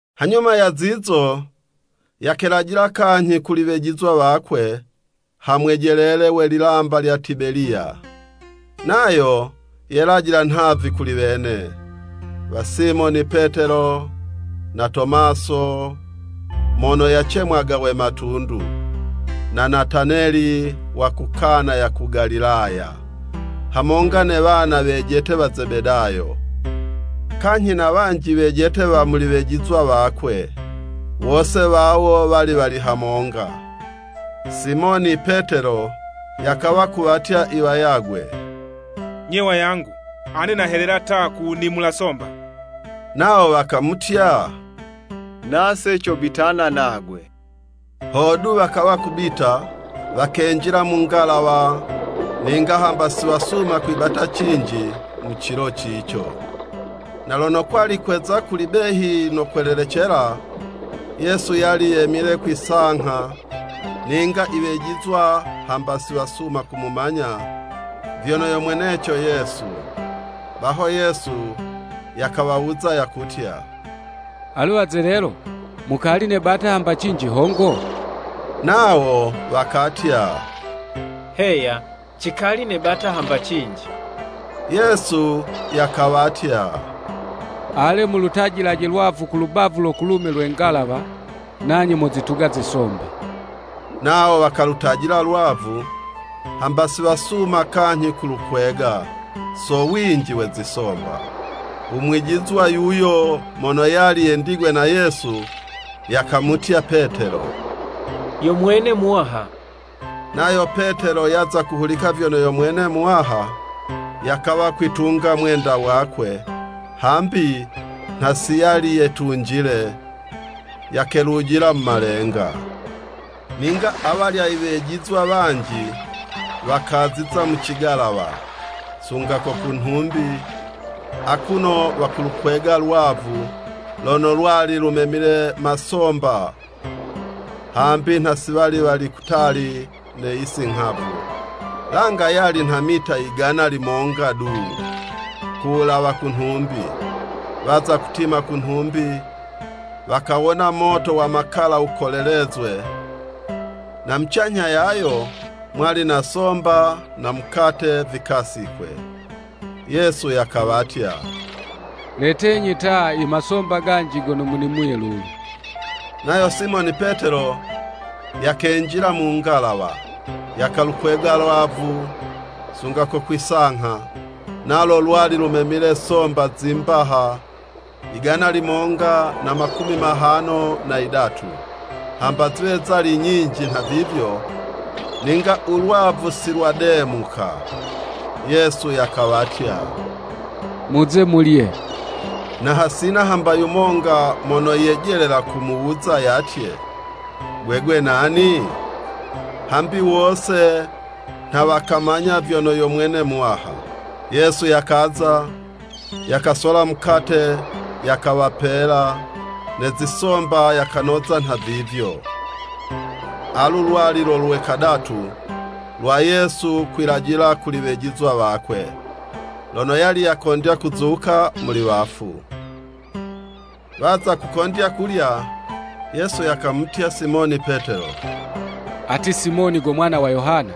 Hanyuma ya zizo, yakelajila kanyhi kuli wejizwa wakwe ha mwejelele we lilamba lya Tibeliya. Nayo yelajila nhavi kuli wene. Wa Simoni Petelo na Tomaso mono yacemwaga we Matundu, na Nataneli wa ku Kana ya ku Galilaya, hamonga ne wana wejete wa Zebedayo, kanyhi na wanji wejete wa muli wejizwa wakwe, wose wawo wali wali hamonga. Simoni Petelo yakawa kuwatya i wayagwe, “Nye wayangu, ane nahelela ta, ku wunimula zisomba.” Nawo wakamutya, “Nase cobitana nagwe.” Hodu, wakawa kubita, wakenjila mu ngalawa, ninga hamba siwasuma kwibata cinji mu cilo cico. Na lono kwali kweza kuli behi no kwelelecela, Yesu yali yemile kwi'sangha, ninga i wejizwa hamba siwasuma kumumanya vyono yo mweneco Yesu. Baho Yesu yakawawuza, yakutya, “Alu wazelelo, mukali nebata hamba cinji hongo?” Nawo wakatya, “Heya, cikali nebata hamba cinji.” Yesu yakawatya, “Ale, mulutajilaje lwavu ku lubavu lo kulume lwe ngalawa, nanye mozituga zisomba.” Nawo wakalutajila lwavu, hamba si wasuma kanyhi kulukwega, so winji we zisomba. U mwijizwa yuyo mono yali yendigwe na Yesu, yakamutya Petelo, “Yo mwene Muwaha.” Nayo Petelo yaza kuhulika vyono yo mwene Muwaha, yakawa kwitunga mwenda wakwe (hambi nha si yali yetunjile) yakelujila mu malenga. Ninga awalya iwejizwa wanji wakaziza mu cigalawa sunga ko ku nhumbi, akuno wakulukwega lwavu lono lwali lumemile masomba, hambi nha si wali wali kutali ne yisi nghavu, langa yali nha meta yigana limonga du, ku wulawa ku nhumbi. Waza kutima ku nhumbi, wakawona moto wa makala wukolelezwe, na mucanyha yayo, mwali na somba na mukate vikasikwe. Yesu yakawatya, “Letenyi ta, imasomba ganji gono munimuye lulu.” Nayo Simoni Petelo, yakenjila mu ngalawa, yakalukwega lwavu sunga ko kwi'sangha, nalo lwali lumemile somba zi mbaha yigana limonga na makumi mahano na yidatu, hamba ziwe zali nyinji nhavivyo, ninga u lwavu si lwademuka. Yesu yakawatya, “Muze mulye.” Na hasina hamba yumonga mono yejelela kumuwuza yatye, “Gwegwe nani?” Hambi wose nha wakamanya vyono yo mwene Muwaha. Yesu yakaza, yakasola mukate yakawapela, ne zisomba yakanoza nhavivyo. Alu lwali lo lwe kadatu, lwa Yesu kwilajila kuli wejizwa wakwe, lono yali yakondya kuzuka muli wafu. Waza kukondya kulya, Yesu yakamutya Simoni Petelo, “Ati Simoni go mwana wa Yohana,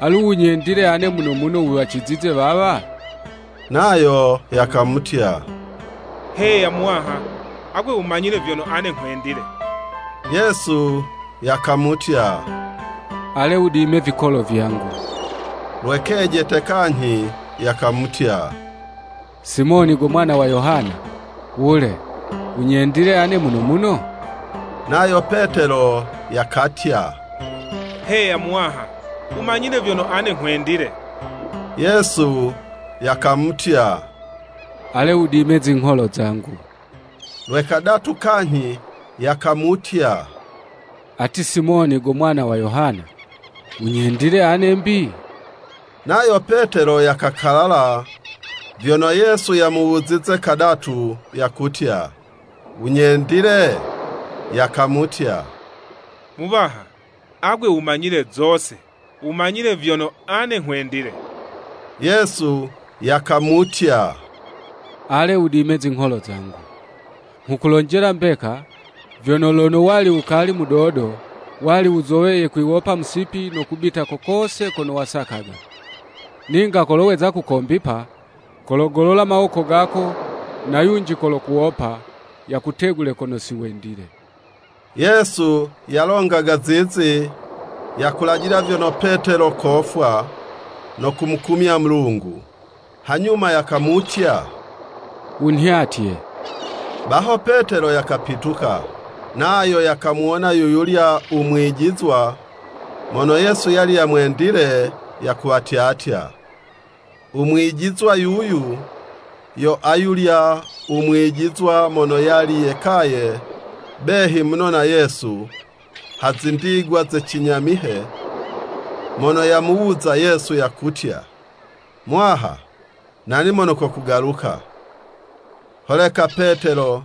alu wunyendile ane muno muno wuwacizize wawa?” Nayo yakamutya, “Heya Muwaha, agwe wumanyile vyono ane nghwendile.” Yesu yakamutya, “Ale wudime vikolo vyangu.” Lwe kejete kanyhi yakamutya, “Simoni go mwana wa Yohana, wule, wunyendile ane muno muno?” Nayo Petelo yakatya, “Heya Muwaha, wumanyile vyono ane nghwendile.” Yesu yakamutya, “Ale wudime zingholo zangu.” Lwe kadatu kanyhi yakamutya, “Ati Simoni go mwana wa Yohana, wunyendile ane 'mbi?” Nayo Petelo yakakalala vyono Yesu yamuwuzize kadatu yakutya, “Wunyendile?” Yakamutya, “Muwaha, agwe wumanyile zose, wumanyile vyono ane nghwendile.” Yesu yakamutya, “Ale wudime zingholo zangu.” Nghukulonjela mbeka, vyono “Lono wali wukali mudodo, wali wuzoweye kwiwopa musipi no kubita ko kose kono wasakaga. Ninga kolo weza kukombipa, kologolola mawoko gako, na yunji kolokuwopa, yakutegule kono si wendile.” (Yesu yalongaga zizi, yakulajila vyono Petelo kofwa no kumukumya Mulungu). Hanyuma yakamutya, “Wunhyatye.” Baho Petelo yakapituka, nayo yakamuwona yuyulya u mwijizwa mono Yesu yali yamwendile, yakuwatyatya. U mwijizwa yuyu, yo ayulya u mwijizwa mono yali yekaye behi muno na Yesu ha zindigwa ze cinyamihe, mono yamuwuza Yesu yakutya, “Muwaha nani mono kokugaluka.” Holeka Petelo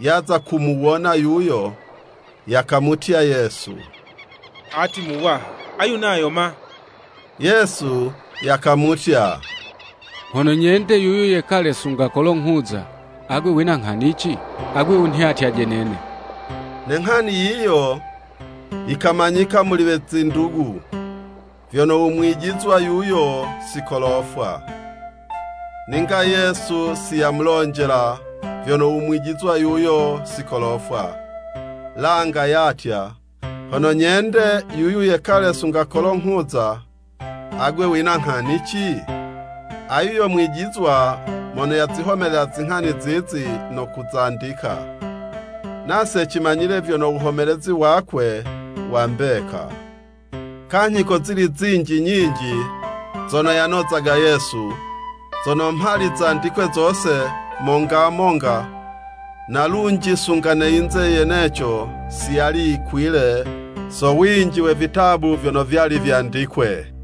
yaza kumuwona yuyo, yakamutya Yesu “Ati Muwaha, ayu nayo ma?” Yesu yakamutya, “Hono nyende yuyu yekale sunga kolo nghuza, agwe wina nghani 'ci? Agwe wunhyatyaje nene.” Ne nghani yiyo yikamanyika muli we zindugu, vyono u mwijizwa yuyo si kolofwa. Ninga Yesu si yamulonjela vyono u mwijizwa yuyo si kolofwa, langa yatya, “Hono nyende yuyu yekale sunga kolo nghuza, agwe wina nghani 'ci?” Ayu yo mwijizwa mono yazihomelela zinghani zizi, no kuzandika. Nase cimanyile vyono wuhomelezi wakwe wa mbeka. Kanyhi kozili zinji nyinji zono yanozaga Yesu, zono mhali zandikwe zose, monga monga, na lunji, sunga ne yinze yeneco si yali yikwile so winji we vitabu vyono vyali vyandikwe.